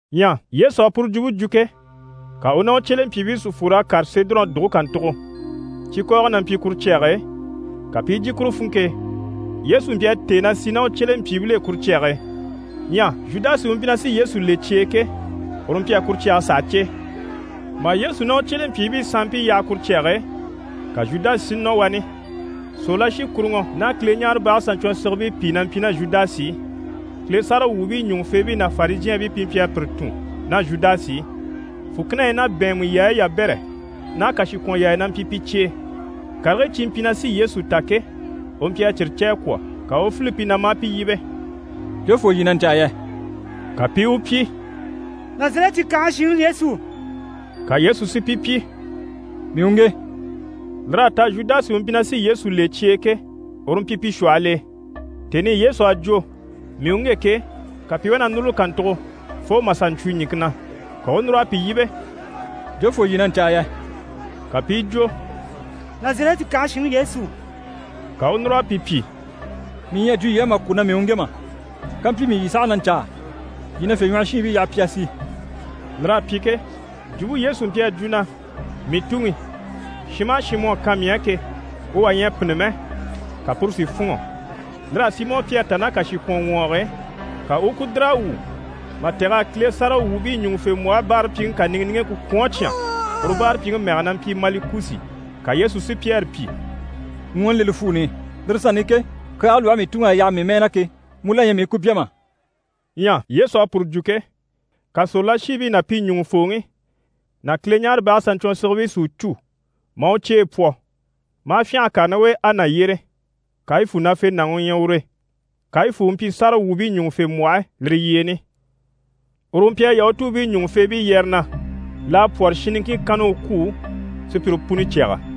Ɲyɛ Yesu à puru jwumpe jwo ke, ka u ná u cyelempyiibii si fwor'a kàre Sedɔrɔn dùge kàntugo. Cikɔɔgɔ na mpyi kuru cyage e, ka pi i jyè kuru funŋke e. Yesu mpyi a têe na sì ná u cyelempyiibil'e kuru cyage e. Ɲyɛ Zhudasi u mpyi na sí Yesu le cye e ke, uru mpyi a kuru cyage saha cè. Mà Yesu ná u cyelempyiibii sanmpii yaha kuru cyage e, ka Zhudasi si nɔ wani. Sòrolashikuruŋɔ ná Kileɲaarebage saɲcwɔnsigibii pìi na mpyi ná Zhudasi i. Kile sáragawwuubii ɲùŋufeebii ná Farizhɛɛnbii pi mpyi a pire tun ná Zhudasi i. Fùkinahii ná bɛ̀ɛnmɛ yaayi yabɛrɛ ná kàshikwɔnyaaya na mpyi pi cye e. Karigii cyi mpyi na sí Yesu ta ke, u mpyi a cyire cè a kwɔ̀. Ka u u file pi na, maa pi yíbe: «Jofoo yii na ɲcaa yɛ?» Ka pi i u pyi: «Nazarɛti kànhe shinŋi Yesu.» Ka Yesu si pi pyi: «Mii u ŋge!» Lir'à ta Zhudasi u mpyi na sí Yesu le cye e ke, uru mpyi pi shwɔhɔl'e. Tèni i Yesu à jwo: «Mii u ŋge!» ke, ka pi i wá na núruli kàntugo fo mà sà ɲcwo ɲìŋke na. Ka u u núr'a pi yíbe: «Jofoo yii na ɲcaa yɛ?» Ka pi i jwo: «Nazarɛti kànhe shinŋi Yesu.» Ka u u núr'a pi pyi: «Mii ɲyɛ a jwo yii á mà kwɔ̀ na mii u ŋge mà? Kampyi mii yii saha na ɲcaa, yii na fyèɲwɔhɔshiinbii yaha pi a sì.» Lir'à pyi ke, jwumpe Yesu à jwo na: «Mii Tuŋi, shin maha shin mu à kan mii á ke, u wà ɲyɛ a pînni mɛ» ka puru si fûnŋɔ. Lir'à Simɔ Pyɛri ta ná kàshikwɔnŋwɔɔg'e, ka u u ku dìr'a wwû mà tɛ̀g'a Kile sáragawwuubii ɲùŋufembwɔhe báarapyiŋi kàniŋɛ niŋgeŋke kwɔ̀n a cyán. Uru báarapyiŋi mɛge na mpyi Malikusi. Ka Yesu si Pyɛri pyi: «Ŋwɔɔni le li fwuuni i. Lire sanni i ke, kyaage lwɔhe mii Tuŋi à yaha mii mɛɛ na ke, mu la ɲyɛ mii u ku bya mà?» Ɲyɛ Yesu à puru jwo ke, ka sòrolashiibii ná pi ɲùŋufooŋi ná Kileɲaarebage saɲcwɔnsigibii si u cû maa u cyeyi pwɔ. Maa fyânha a kàre ná u e Ana yyére, Kayifu nafenaŋi u ɲyɛ ure. Kayifu u mpyi sáragawwuubii ɲùŋufembwɔhe lire yyeeni. Uru u mpyi a Yahutuubii ɲùŋufeebii yɛrɛ na: «L'à pwɔ́rɔ shin niŋkin kanna u kwû sùpyire puni cyaga.»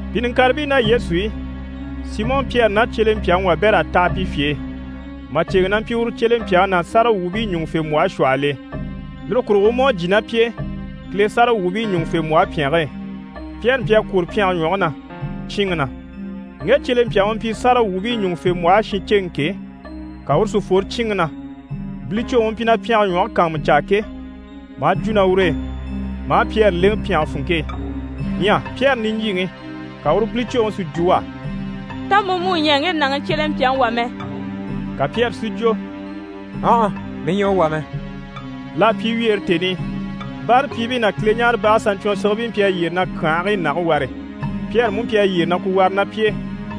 Pi niŋkaribii ná Yesu i, Simɔ Pyɛri ná cyelempyaŋi wabɛr'à taha pi fye e, màceŋɛ na mpyi uru cyelempyaŋi ná sáragawwuubii ɲùŋufembwɔhe shwɔhɔl'e. Lire kurugo u mú à jyè ná pi e Kile sáragawwuubii ɲùŋufembwɔhe pyɛnge e. Pyɛri mpyi a kwôro pyɛnge ɲwɔge na, cyíinŋi na. Ŋge cyelempyaŋi u mpyi sáragawwuubii ɲùŋufembwɔhe shinceŋi ke, ka uru si fworo cyíinŋi na, bilicwoŋi u mpyi na pyɛnge ɲwɔge kàanmucaa ke, maa jwo ná ur'e, maa Pyɛri lèŋɛ pyɛnge funŋke e. Ɲyɛ Pyɛri niɲjyiŋi, ka uru bilicwoŋi si jwo u á: «Tá mu mú ɲyɛ ŋge nàŋi cyelempyaŋi wà mɛ?» Ka Pyɛri si jwo: «Ɔnhɔ, mii ɲyɛ u wà mɛ!» L'à pyi wyeere tèni i, báarapyiibii ná Kileɲaarebage saɲcwɔnsigibii mpyi a yyére na kyànhigii nage ware, Pyɛri mú mpyi a yyére na ku ware ná pi e.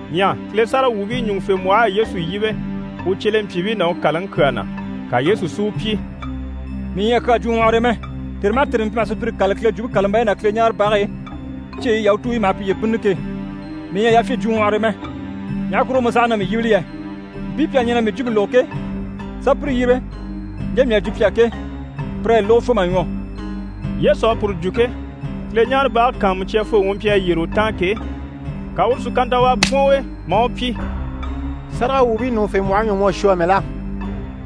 Ɲyɛ Kile sáragawwuubii ɲùŋufembwɔh'à Yesu yíbe u cyelempyiibii ná u kàlaŋi kyaa na. Ka Yesu si u pyi: «Mii ɲyɛ a kyaa jwo ŋwɔhɔre e mɛ. Tère maha tère mii mpyi maha sùpyire kâlali Kile Jwumpe kàlambayi ná Kileɲaarebage e, cyeyi i Yahutuubii maha piye bínnini ke. Mii ɲyɛ a yafyin jwo ŋwɔhɔre e mɛ. Ɲaha kurugo mu saha na mii yíbili yɛ? Mpii pi à ɲɛn'a mii jwumpe lógo ke, sà pire yíbe ɲje mii à jwo pi á ke, pir'à yi lógo fo mà ɲwɔ.» Yesu à puru jwo ke, Kileɲaarebage kàanmucyafooŋi u mpyi a yyére u taan ke, ka uru si kantawaa bwɔ̀n u e, maa u pyi: «Sáragawwuubii ɲùŋufembwɔhe ɲwɔ mu à shwɔ amɛ la?»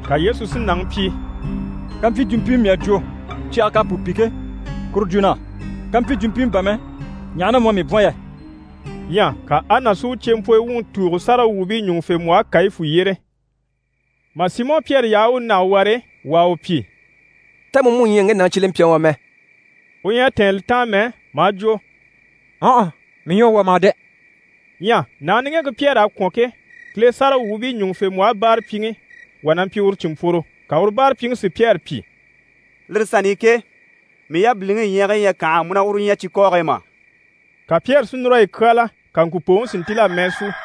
Ka Yesu si nàŋi pyi: «Kampyi jwumpimɛ mii à jwo, cyage k'à pu pi ke, kuru jwo na á. Kampyi jwumpimɛ bà mɛ, ɲaha na mu à mii bwɔ̀n yɛ?» Ɲyɛ ka Ana si u cyempwɔ wuŋi tùugo sáragawwuubii ɲùŋufembwɔhe Kayifu yyére. Mà Simɔ Pyɛri yaha u u nage ware, wà à u pyi: «Tá mu mú ɲyɛ ŋge nàŋi cyelempyaŋi wà mɛ?» U ɲyɛ a tɛ̀ɛn li taan mɛ, maa jwo: «Ɔnhɔ, mii ɲyɛ u wà mà dɛ!» Ɲyɛ nàŋi niŋgeŋke Pyɛri a kwɔ̀n ke, Kile sáragawwuubii ɲùŋufembwɔhe báarapyiŋi wà na mpyi uru cìnmpworo. Ka uru báarapyiŋi si Pyɛri pyi: «Lire sanni i ke, mii yabiliŋi ɲyiigii ɲyɛ a kànha a mu ná uru ɲya cikɔɔge e mà?» Ka Pyɛri si núr'a yi kyáala. Ka ŋkùpooŋi si ntíl'a mɛɛ sú.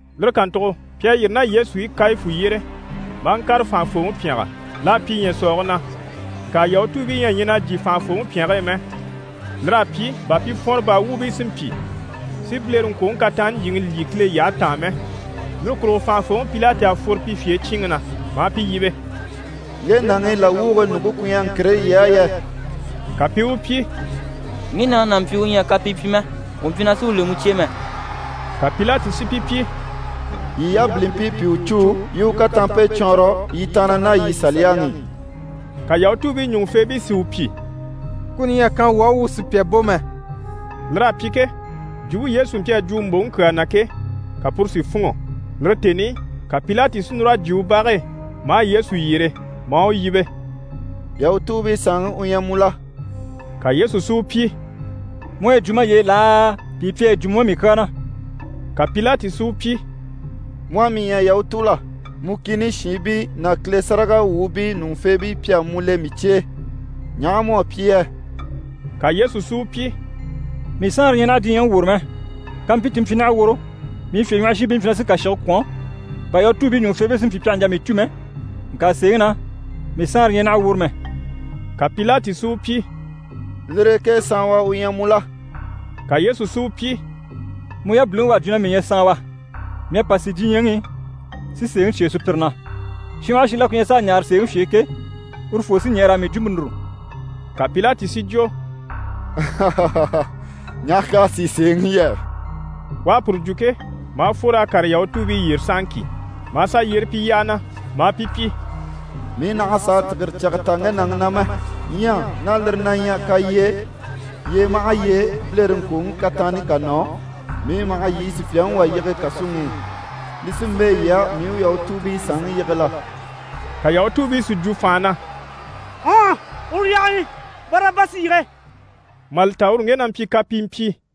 Lire kàntugo pi à yîri ná Yesu i Kayifu yyére maa ŋkàre fànhafooŋi pyɛngɛ. L'à pyi ɲyɛ̀sɔɔge na. Ŋka Yahutuubii ɲyɛ a ɲɛn'a jyè fànhafooŋi pyɛnge e mɛ. Lir'à pyi bà pi fwɔnrɔ baa wuubii si mpyi si bilereŋkwoŋi kataanni ɲjyìŋi lyî Kile yyahe taan mɛ. Lire kurugo fànhafooŋi Pilati à fworo pi fye e cyíinŋi na, maa pi yíbe: «Ŋge nàŋi làwwuge ɲùŋke ku ɲyɛ ŋkire yii á yɛ?» Ka pi i u pyi: «Ŋge nàŋi n'a mpyi u ɲyɛ a kapii pyi mɛ, wuu mpyi na sí u le mu cye e mɛ.» Ka Pilati si pi pyi: «Yii yabilimpii pi u cû yii i u kataanmpe cwɔɔnrɔ yii tàanna ná yii Saliyaŋi i.» Ka Yahutuubii ɲùŋufeebii si u pyi: «Kuni ɲyɛ a kan wuu á, wuu sùpya bò mɛ.» Lir'à pyi ke, jwumpe Yesu mpyi a jwo u mbòŋi kyaa na ke, ka puru si fûnŋɔ. Lire tèni i, ka Pilati si núr'a jyè u bage e, maa Yesu yyere, maa u yíbe: «Yahutuubii Saanŋi u ɲyɛ mu la?» Ka Yesu si u pyi: «Mu à yi jwo maye e laa, pìi pi à yi jwo mu á mii kyaa na?» Ka Pilati si u pyi: «Mu à mii ɲya Yahutu la? Mu kìni shiinbii ná Kile sáragawwuubii ɲùŋufeebii pi à mu le mii cye e. Ɲaha mu à pyi yɛ?» Ka Yesu si u pyi: «Mii Saanre ɲyɛ naha diɲyɛŋi woro mɛ. Kàmpyi ti mpyi naha woro, mii fyèɲwɔhɔshiinbii mpyi na sí kàshige kwɔ̀n, bà Yahutuubii ɲùŋufeebii si mpyi pi àha ɲjà mii cû mɛ, ŋka sèeŋi na, mii Saanre ɲyɛ naha woro mɛ.» Ka Pilati si u pyi: «Lire e ke saanwa u ɲyɛ mu la?» Ka Yesu si u pyi: «Mu yabiliŋi u à jwo na mii ɲyɛ saanwa! Mii à pa si diɲyɛŋi i, si sèeŋi cyêe sùpyire na. Shin maha shin la ku ɲyɛ s'a ɲaare sèeŋi fye e ke, urufoo sí ɲɛɛ raa mii jwumpe núru.» Ka Pilati si jwo: «Ɲaha k'à sìi sèeŋi yɛ?» U à puru jwo ke, maa fwor'a kàre Yahutuubii yyére sahaŋki, maa sà yyére pi yyaha na, maa pi pyi: «Mii nàha sàa tìgire cyage ta ŋge nàŋi na mɛ! Ɲyɛ ná lire na ɲyɛ kalyee, yyee maha yyee bilereŋkwoŋi kataanni ká nɔ, mii maha yii sùpya yige kàsuŋi i, li sí n‑bɛ̂ yii á mii u Yahutuubii Saanŋi yige la?» Ka Yahutuubii si jwo fànha na: «Ɔnhɔ, uru yaha wani! Barabasi yige!» Mà li ta uru ŋge na mpyi kapimpyi.